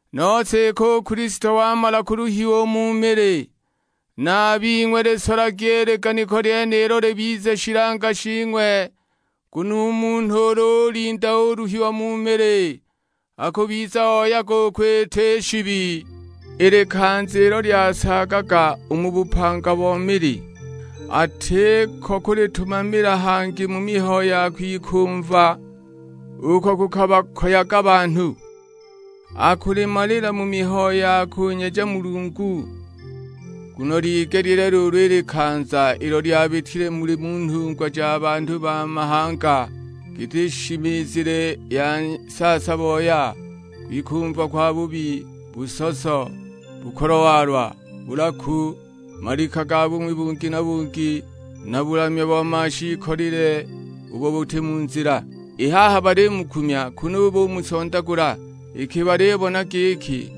Nose iki u Kilisto wamala kuluhiwa u mu mili, na a bing'we lisolagi i liganiko lyenilo libize shilanga shing'we; nguno u munhu ulu ulinda uluhiwa mu mili akubiza oyaga u kwita i shibi. I likanza ilo lyasaagaga u mu bupanga bo mili, atiko kulitumamila hangi mu mihayo ya kwikumva uko kukabakoyaga banhu, akulimalila mu mihayo ya kunyeja Mulungu. Nguno ligelile luulu i likanza ilo lyabitile muli mu nhungwa ja banhu ba mahanga; giti shimizile ya saasa-boya, kwikumva kwabubi, busoso, bukolwa-walwa, bulaku, malika ga bung'wi bungi na bungi, na bulamya bo mashiikolile ubo buti mu nzila. I haha baliyumukumya kunu bumusondagula, iki balibona giki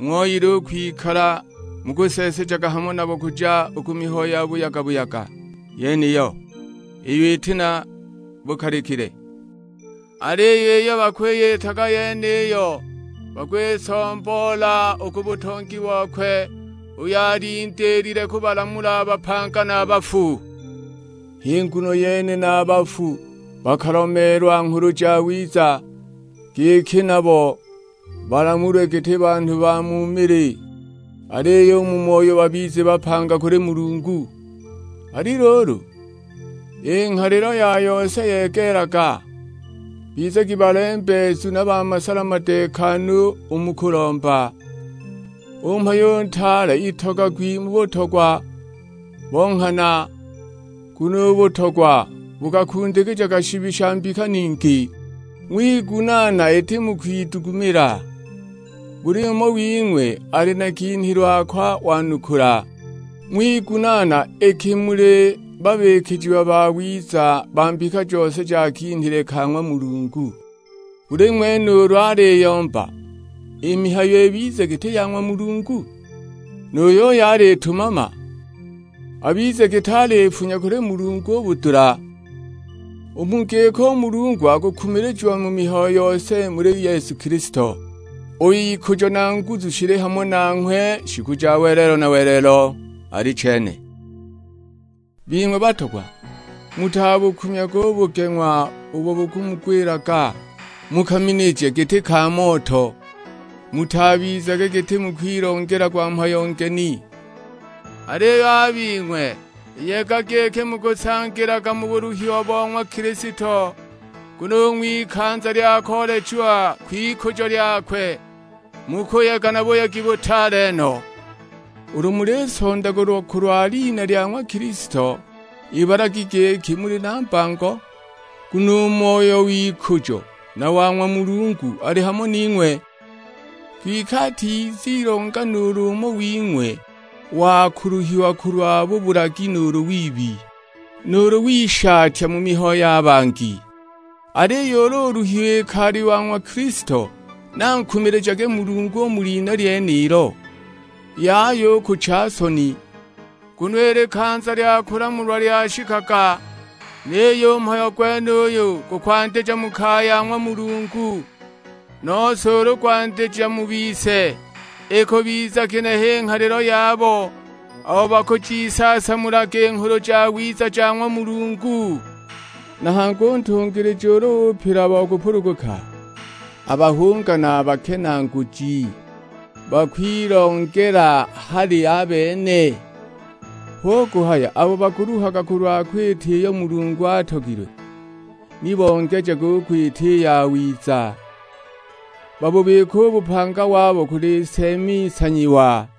ng'ooyile u kwikala mukuseesejaga hamo nabo kuja u ku mihayo ya buyaga-buyaga yeniyo, iyo iti na bukalikile. Aliyo iyo bakwiyitaga yeniyo bakwisomboola u ku butongi bokwe uyo alindiilile kubalamula a bapanga na a bafu. H'i nguno yene na a bafu bakalomeelwa Nghulu Jawiza, giki nabo balamulwe giti banhu ba mu mili, aliyo u mu moyo babize bapanga kuli Mulungu. Ali luulu, i nghalilo ya yose yegeelaga; bizagi balembeezu na ba masala madeekanu u mu kulomba. U mhayo u ntaale itogagwi mu butogwa bo nghana, nguno u butogwa bukakundikijaga shibi sha mbika ningi. Ng'wigunaana iti mu kwidugumila. Buli umo wing'we ali na kinhilwe ako wanukula; ng'wigunaana iki muli babikijiwa bawiza ba mbika jose ja kinhile ka ng'wa Mulungu. Buli ng'wene ulu aliyomba, i mihayo ibize giti ya ng'wa Mulungu. Nu yuyo alitumama, abize giti alifunya kuli Mulungu u budula. U mu giko u Mulungu akukumilijiwa mu mihayo yose muli Yesu Kilisto, uyo ikujo na nguzu shili hamo nanghwe shiku ja welelo na welelo: Alichene. Bing'we batogwa, mutabukumyage u bugeng'wa ubo bukumugwilaga, mu kaminije giti ka moto. Mutabizage giti mukwilongelagwa mhayo ngeni. Aliyo a bing'we yegagi iki mukusangilaga mu buluhiwa bo ng'wa Kilisto, nguno u ng'wikanza lya koolechiwa kw'ikujo lyakwe mukuyega na buyegi butaale no. Ulu mulisondagulwa kulwa lina lya ng'wa Kilisto ibalagi giki muli na mbango, nguno u Moyo w'ikujo na wa ng'wa Mulungu ali hamo ning'we. Kwike atizilonga nuulu umo wing'we wa kuluhiwa kulwa bubulagi nuulu wibi, nuulu wishatya mu mihayo ya bangi. Aliyo ulu uluhiwa iki ali wa ng'wa Kilisto, ni ankumilijage Mulungu u mu lina lyenilo; yaya u kucha soni. Nguno i likanza lya kulamulwa lyashikaga, niyo u mhayo gwenuyo gukwandija mu kaya ya ng'wa Mulungu. Nose ulu gwandija mu bise, ikubiza ginehe i nghalilo yabo abo bakujiisaasamulaga i Nghulu Jawiza ja ng'wa Mulungu? Na hangi u ntungilija ulu upila bo kupuluguka, a bahunga na a bakenaaguji bakwilongela hali a bene? Hu kuhaya abo bakuluhaga kulwa kwita iyo Mulungu atogilwe, ni bongejage u kwita i yawiza, babubike u bupanga wabo kuli Nseemi nsanyiwa.